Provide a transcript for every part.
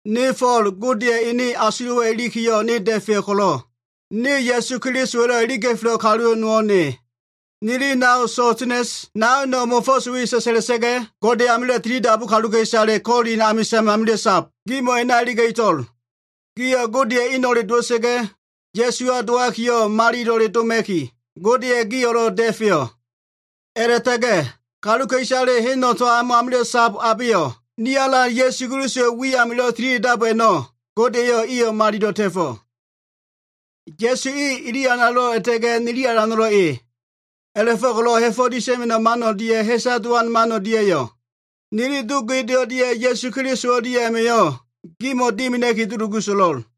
Ne Fo꞉l, Godeya꞉ ene asulo꞉wa꞉ ilikiyo꞉, ne da꞉feyo꞉ ko꞉lo꞉, ne Ya꞉su Kelisowa꞉lo꞉ iliga꞉felo꞉ kalu nowo꞉ ne. Nili nao Sostenes naino꞉ mo꞉fo꞉s we sa꞉sa꞉la꞉sa꞉ga꞉, Gode amilo꞉ tilidabu kaluka꞉isale Kolin amisa꞉n usamilo꞉ sab gimo꞉ a꞉na iliga꞉to꞉l. Gio꞉ Godeya꞉ eno꞉le dowa꞉sa꞉ga꞉, Ya꞉suwa dowakiyo꞉ malilo꞉le doma꞉ki, Godeya꞉ gio꞉lo꞉ da꞉feyo꞉. A꞉la꞉ta꞉ga꞉ kaluka꞉isale heno꞉ tambo amilo꞉ sab abeyo꞉ ni Alan Ya꞉su Kelisowa꞉ wi amilo꞉ tilida꞉dab i a꞉no꞉, Gode eyo꞉ iyo꞉ malilo꞉ ta꞉fo꞉. Ya꞉su e, ili Alano꞉lo꞉, a꞉la꞉ta꞉ga꞉ nili Alano꞉lo꞉ e. A꞉la꞉fo꞉ko꞉lo꞉ ha꞉fo꞉ disa꞉ma꞉no꞉ man o꞉lia꞉ ha꞉sa dowan man o꞉lia꞉yo꞉, nili Do Gode o꞉lia꞉ Alan Ya꞉su Keliso o꞉lia꞉ma꞉yo꞉ gimo꞉ dimina꞉ki dulugu so꞉lo꞉l.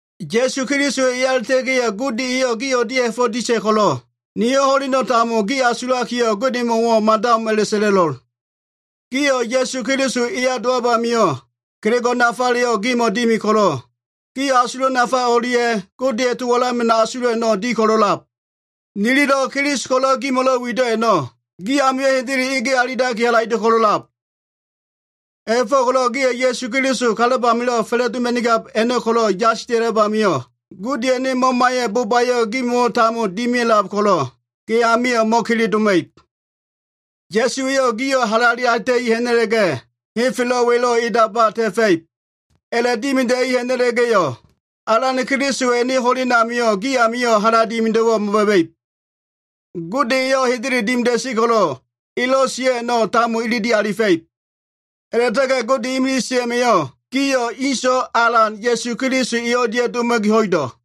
Ya꞉su Keliso eya a꞉la꞉ta꞉ga꞉yo꞉ Gode eyo꞉ gi o꞉lia꞉yo꞉ ha꞉fo꞉ disa꞉ ko꞉lo꞉, niyo꞉ ho꞉leno꞉ tambo gi asulakiyo꞉ Godemo꞉wo꞉ mada o꞉m a꞉la꞉ sa꞉la꞉lo꞉l. Gio꞉ Ya꞉su Keliso eya dowab amio꞉, kelego꞉ nafaleyo꞉ gimo꞉ dimi ko꞉lo꞉, gio꞉ asulo꞉ nafale o꞉lia꞉, Godeya꞉ to walama꞉no꞉ asulo꞉ a꞉no꞉lo꞉ di ko꞉lo꞉lab. Nililo꞉ Keliso ko꞉lo꞉ gimo꞉lo꞉ wido꞉ a꞉no꞉, gi amio꞉ hendele ege alilaki, halaido꞉ a꞉lab. A꞉la꞉fo꞉ko꞉lo꞉ gio꞉ Alan Ya꞉su Keliso kalab amilo꞉ fa꞉la꞉doma꞉nigab a꞉no꞉ ko꞉lo꞉ yasila꞉lab amio꞉, Godeya꞉ Mama eyo꞉ bobayo꞉ gimo꞉wo꞉ tambo dimia꞉lab ko꞉lo꞉, gi amio꞉ mo꞉kele doma꞉ib. Ya꞉su eyo꞉ gio꞉ halale alita꞉i ha꞉na꞉la꞉ga꞉, henfelo꞉ welo꞉ edaba ta꞉fa꞉ib. A꞉la꞉dimida꞉li ha꞉na꞉la꞉ga꞉yo꞉, Alan Ya꞉su Kelisowa꞉ ho꞉len a꞉namio꞉ gi amio꞉ hala dimido꞉wo꞉ mo꞉ba꞉ba꞉ib. Gode eyo꞉ hendele dimida꞉sen ko꞉lo꞉, elo꞉ sio꞉ a꞉no꞉ tambo ilili alifa꞉ib. A꞉la꞉ta꞉ga꞉ Gode imilise a꞉ma꞉yo꞉ gio꞉ ene so꞉wa Alan Ya꞉su Keliso o꞉lia꞉ doma꞉ki ho꞉ido꞉.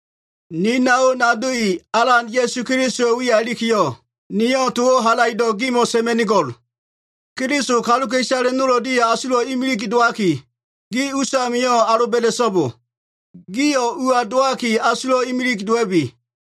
Ni nao nado i, Alan Ya꞉su Kelisowa꞉ wiya ilikiyo꞉, niyo꞉ towo꞉ halaido꞉ gimo꞉ sa꞉ma꞉nigo꞉l. Keliso kaluka꞉isale nol o꞉lia꞉yo꞉ asulo꞉ imilig dowaki, gi usamio꞉ aloba꞉da꞉so꞉bo. Gio꞉ ua dowaki asulo꞉wo꞉ imilise dowa꞉bi.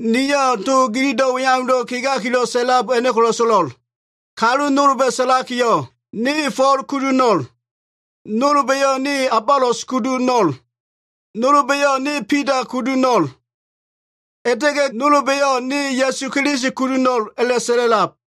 Niyo꞉ gililo꞉ to weaundo꞉ kegakilo꞉ sa꞉lab a꞉no꞉ ko꞉lo꞉ so꞉lo꞉l. Kalu nolba꞉ sa꞉lakiyo꞉, “Ne Fo꞉l kudu ho꞉no꞉l.” Nolba꞉yo꞉, “Ne Abolos kudu ho꞉no꞉l.” Nolba꞉yo꞉, “Ne Bida kudu ho꞉no꞉l.” A꞉la꞉ta꞉ga꞉ nolba꞉yo꞉, “Ne Ya꞉su Keliso kudu ho꞉no꞉l” a꞉la꞉sa꞉la꞉lab.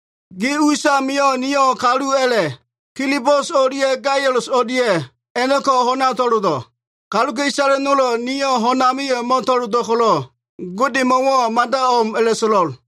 Gi us a꞉namio꞉ niyo꞉ kalu a꞉la꞉, Kilisbus o꞉lia꞉ Gaius o꞉lia꞉ a꞉no꞉ko꞉ ho꞉na to꞉lolo꞉. Kaluka꞉isale nolo꞉ niyo꞉ ho꞉n amio꞉ mo꞉to꞉lolo꞉ ko꞉lo꞉, Godemo꞉wo꞉ mada o꞉m a꞉la꞉so꞉lo꞉l.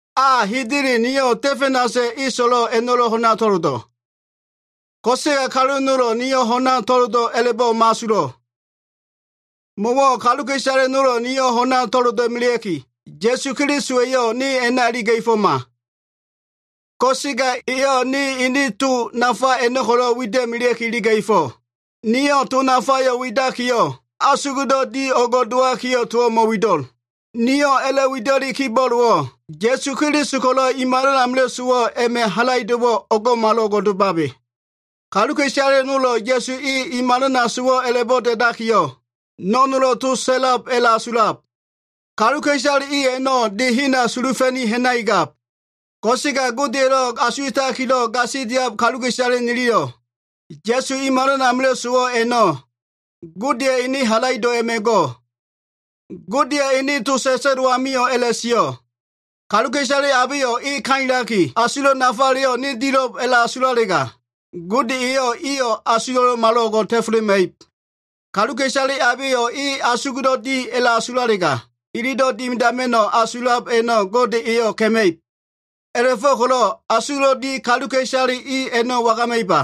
A, hendele niyo꞉ Stefanasa꞉ eso꞉lo꞉ a꞉no꞉lo꞉ ho꞉na to꞉lolo꞉. Ko꞉sega kalu nolo꞉ niyo꞉ ho꞉na to꞉lolo꞉ a꞉la꞉bo꞉ mo꞉asulo꞉. Mo꞉wo꞉ kaluka꞉isale nolo꞉ niyo꞉ ho꞉na to꞉lola꞉melea꞉ki, Ya꞉su Keliso eyo꞉ ne a꞉na iliga꞉foma. Ko꞉sega eyo꞉ ne ene to nafa a꞉no꞉ ko꞉lo꞉ fanda wida꞉melea꞉ki iliga꞉fo꞉. Niyo꞉ to nafayo꞉ widakiyo꞉, asugdo꞉ di o꞉ngo꞉ dowakiyo꞉ towo꞉ mo꞉wido꞉. Niyo꞉ a꞉la꞉wida꞉li kibo꞉bowo꞉ Ya꞉su Keliso ko꞉lo꞉ i malan amilo꞉ sowo꞉ a꞉ma꞉ halaido꞉wo꞉ o꞉ngo꞉malo꞉ngo꞉ domabe. Kaluka꞉isale nolo꞉ Ya꞉su e i malana sowo꞉ a꞉la꞉bo꞉ da꞉dakiyo꞉, no꞉nolo꞉ to sa꞉lab a꞉la꞉asulab. Kaluka꞉isale i a꞉no꞉ de hena sulufa꞉ ha꞉nakigab. Ko꞉sega Godeya꞉lo꞉ asuwa꞉takilo꞉ gasilia꞉lab kaluka꞉isale niliyo꞉, Ya꞉su i malan amilo꞉ sowo꞉ a꞉no꞉ Godeya꞉ ene halaido꞉ a꞉ma꞉ go꞉. Godeya꞉ ene to sa꞉sa꞉lo꞉ amio꞉ a꞉la꞉sio꞉, “Kaluka꞉isale abeyo꞉ e kailaki asulo꞉ nafaleyo꞉ ne dilo꞉b a꞉la꞉asulalega, Gode eyo꞉ iyo꞉ asulo꞉wo꞉ malo꞉ngo꞉ ta꞉felema꞉ib. Kaluka꞉isale abeyo꞉ e asugdo꞉ di a꞉la꞉asulalega, ililo꞉ dimidama꞉no꞉ asulab a꞉no꞉ Gode eyo꞉ ka꞉ma꞉ib.” A꞉la꞉fo꞉ko꞉lo꞉ asugdo꞉ di kaluka꞉isale i a꞉no꞉ wagama꞉iba?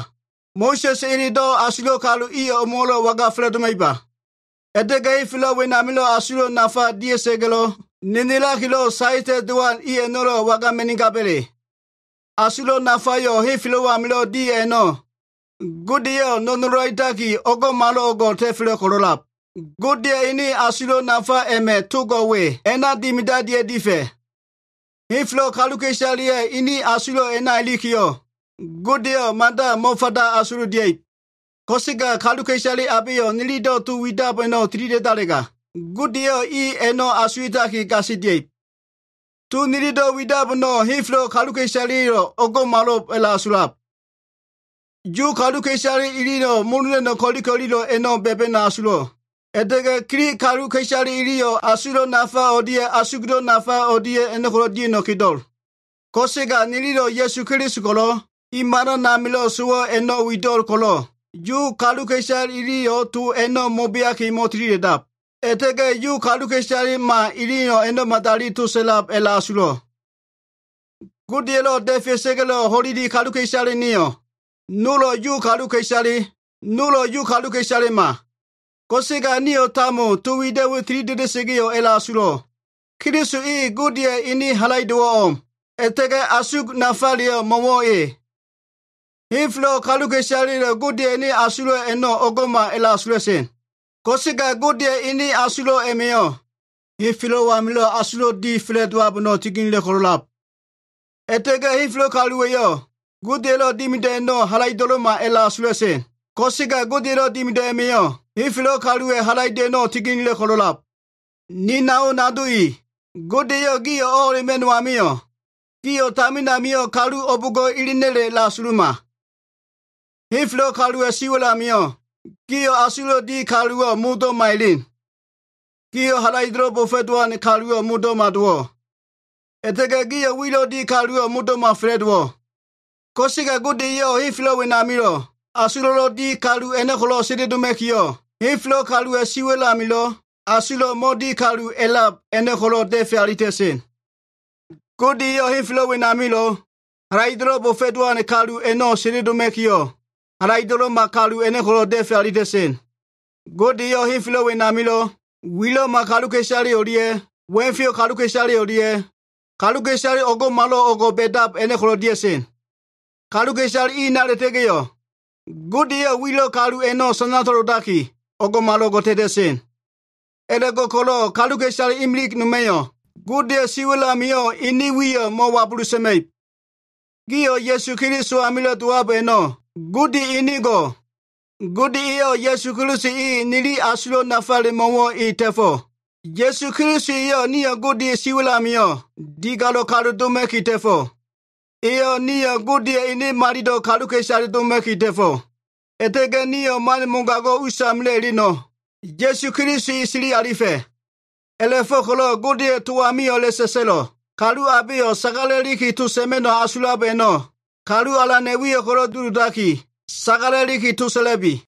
Mo꞉sa꞉sa꞉ elelo꞉ asulo꞉ kalu i o꞉mo꞉wo꞉lo꞉ waga fa꞉la꞉doma꞉iba? A꞉la꞉ta꞉ga꞉ henfelo꞉ wenamilo꞉ asulo꞉wo꞉ nafa dia꞉sa꞉ga꞉lo꞉ nenelakilo꞉ saeta꞉lowan kalu i a꞉no꞉lo꞉ wagama꞉nigaba꞉le? Asulo꞉ nafayo꞉ henfelo꞉ amilo꞉ di a꞉no꞉ Gode eyo꞉ no꞉nolo꞉ alitaki o꞉ngo꞉malo꞉ngo꞉ ta꞉felo꞉ ko꞉lo꞉lab Godeya꞉ ene asulo꞉ nafale a꞉ma꞉ togo꞉ we a꞉na dimidalia꞉ difa꞉. Henfelo꞉ kaluka꞉isaleya꞉ ene asulo꞉ a꞉na ilikiyo꞉, Godeyo꞉ mada mo꞉fanda asululia꞉ib. Ko꞉sega kaluka꞉isale abeyo꞉ nililo꞉ to widab a꞉no꞉ tilida꞉dalega, Gode eyo꞉ i a꞉no꞉ asuwa꞉taki gasilia꞉ib. To nililo꞉ widab a꞉no꞉ henfelo꞉ kaluka꞉isaleya꞉yo꞉ o꞉ngo꞉mal a꞉la꞉asulab. Yu kaluka꞉isale iliyo꞉ molo ha꞉na꞉no꞉ ko꞉li ko꞉lilo꞉ a꞉no꞉ ba꞉ba꞉no꞉ asulo꞉, a꞉la꞉ta꞉ga꞉ Gilig kalu iliyo꞉ asulo꞉ nafa o꞉lia꞉ asug nafa o꞉lia꞉yo꞉ ko꞉lo꞉ dia꞉no꞉ kedo꞉. Ko꞉sega niliyo꞉ Ya꞉su Keliso ko꞉lo꞉ i malan amilo꞉ sowo꞉ a꞉no꞉ wida꞉lo꞉l ko꞉lo꞉, Yu kaluka꞉isale iliyo꞉ to a꞉no꞉ mo꞉beaki mo꞉tilida꞉dab, a꞉la꞉ta꞉ga꞉ Yu kaluka꞉isalema iliyo꞉ a꞉no꞉ madali to sa꞉lab a꞉la꞉asulo꞉. Godeya꞉lo꞉ da꞉fea꞉sa꞉ga꞉lo꞉ ho꞉leli kaluka꞉isale nio꞉, nolo꞉ Yu kaluka꞉isale, nolo꞉ Yu kaluka꞉isalema. Ko꞉sega nio꞉ tambo to wido꞉ we tilida꞉da꞉sa꞉ga꞉yo꞉ a꞉la꞉asulo꞉, Keliso e Godeya꞉ ene halaido꞉wo꞉ o꞉m, a꞉la꞉ta꞉ga꞉ asug nafaleyo꞉ mo꞉wo꞉ E. Henfelo꞉ kaluwa꞉yo꞉ Godeya꞉ ene asulo꞉ a꞉no꞉ o꞉ngo꞉ma a꞉la꞉asula꞉sen. Ko꞉sega Godeya꞉ ene asulo꞉ a꞉ma꞉yo꞉ henfelo꞉ amilo꞉ asugdo꞉ di fa꞉la꞉dowab a꞉no꞉ tininila꞉ ko꞉lo꞉lab. A꞉la꞉ta꞉ga꞉ henfelo꞉ kaluwa꞉yo꞉ Godeya꞉lo꞉ dimido꞉ a꞉no꞉ halaido꞉lo꞉ma a꞉la꞉asula꞉sen ko꞉sega, Godeya꞉lo꞉ dimido꞉ a꞉ma꞉yo꞉ henfelo꞉ kaluwa꞉ halaido꞉ a꞉no꞉ tininila꞉ ko꞉lo꞉lab. Ni nao nado i, Gode eyo꞉ gio꞉ o꞉ho꞉lema꞉no꞉ amio꞉, gio꞉ tamin amio꞉ kalu o꞉bo꞉ngo꞉ elena꞉le asuluma. Henfelo꞉ kaluwa꞉ siwa꞉l amio꞉, gio꞉ asulo꞉lo꞉ di kaluwo꞉ modo꞉lo꞉ mo꞉elen. Gio꞉ halaido꞉lo꞉ bo꞉fo꞉lowan kaluwo꞉ modo꞉lo꞉ mo꞉dowo꞉. A꞉la꞉ta꞉ga꞉ gio꞉ wilo꞉ di kaluwo꞉ modo꞉lo꞉ mo꞉fa꞉la꞉dowo꞉. Ko꞉sega Gode eyo꞉ henfelo꞉ wenamilo꞉ asulo꞉lo꞉ di kalu a꞉no꞉ ko꞉lo꞉ sendeloma꞉kiyo꞉, henfelo꞉ kaluwa꞉ siwa꞉l amilo꞉ asulo꞉lo꞉ mo꞉di kalu a꞉lab a꞉no꞉ ko꞉lo꞉ da꞉fe alita꞉sen. Gode eyo꞉ henfelo꞉ wenamilo꞉ halaido꞉lo꞉ bo꞉fo꞉lowan kalu a꞉no꞉ sendeloma꞉kiyo꞉, halaido꞉lo꞉ma kalu a꞉no꞉ ko꞉lo꞉ da꞉fe alita꞉sen. Gode eyo꞉ henfelo꞉ wenamilo꞉ wilo꞉ma kaluka꞉isale o꞉lia꞉, wa꞉feyo꞉ kaluka꞉isale o꞉lia꞉, kaluka꞉isale o꞉ngo꞉malo꞉ o꞉ngo꞉ ba꞉dab a꞉no꞉ ko꞉lo꞉ dia꞉sen. Kaluka꞉isale i a꞉na a꞉la꞉ta꞉ga꞉yo꞉, Gode eyo꞉ wilo꞉ kalu a꞉no꞉ sana to꞉lolaki, o꞉ngo꞉malo꞉ngo꞉ ta꞉ta꞉sen. A꞉la꞉go꞉ko꞉lo꞉ kaluka꞉isale imilig noma꞉yo꞉ Godeya꞉ siwa꞉l amio꞉ enen wiyo꞉ mo꞉wabulu sa꞉ma꞉ib. Gio꞉ Ya꞉su Keliso amilo꞉ dowab a꞉no꞉, Gode enen go꞉. Gode eyo꞉ Ya꞉su Keliso e nili asulo꞉ nafale mo꞉wo꞉ e ta꞉fo꞉. Ya꞉su Keliso eyo꞉ nio꞉ Godeya꞉ siwa꞉l amio꞉ digalo꞉ kalu doma꞉ki ta꞉fo꞉. Eyo꞉ nio꞉ Godeya꞉ ene malilo꞉ kaluka꞉isale doma꞉ki ta꞉fo꞉. A꞉la꞉ta꞉ga꞉ nio꞉ man mogago꞉ usamilo꞉ eleno꞉, Ya꞉su Keliso e sili alifa꞉. A꞉la꞉fo꞉ko꞉lo꞉ Godeya꞉ to amio꞉ a꞉la꞉sa꞉sa꞉lo꞉, “Kalu abeyo꞉ sagala꞉liki to sa꞉ma꞉no꞉ asulab a꞉no꞉, Kalu Alana꞉ wiyo꞉ ko꞉lo꞉ duludakiyo꞉, towo꞉ sagala꞉liki sa꞉la꞉bi.”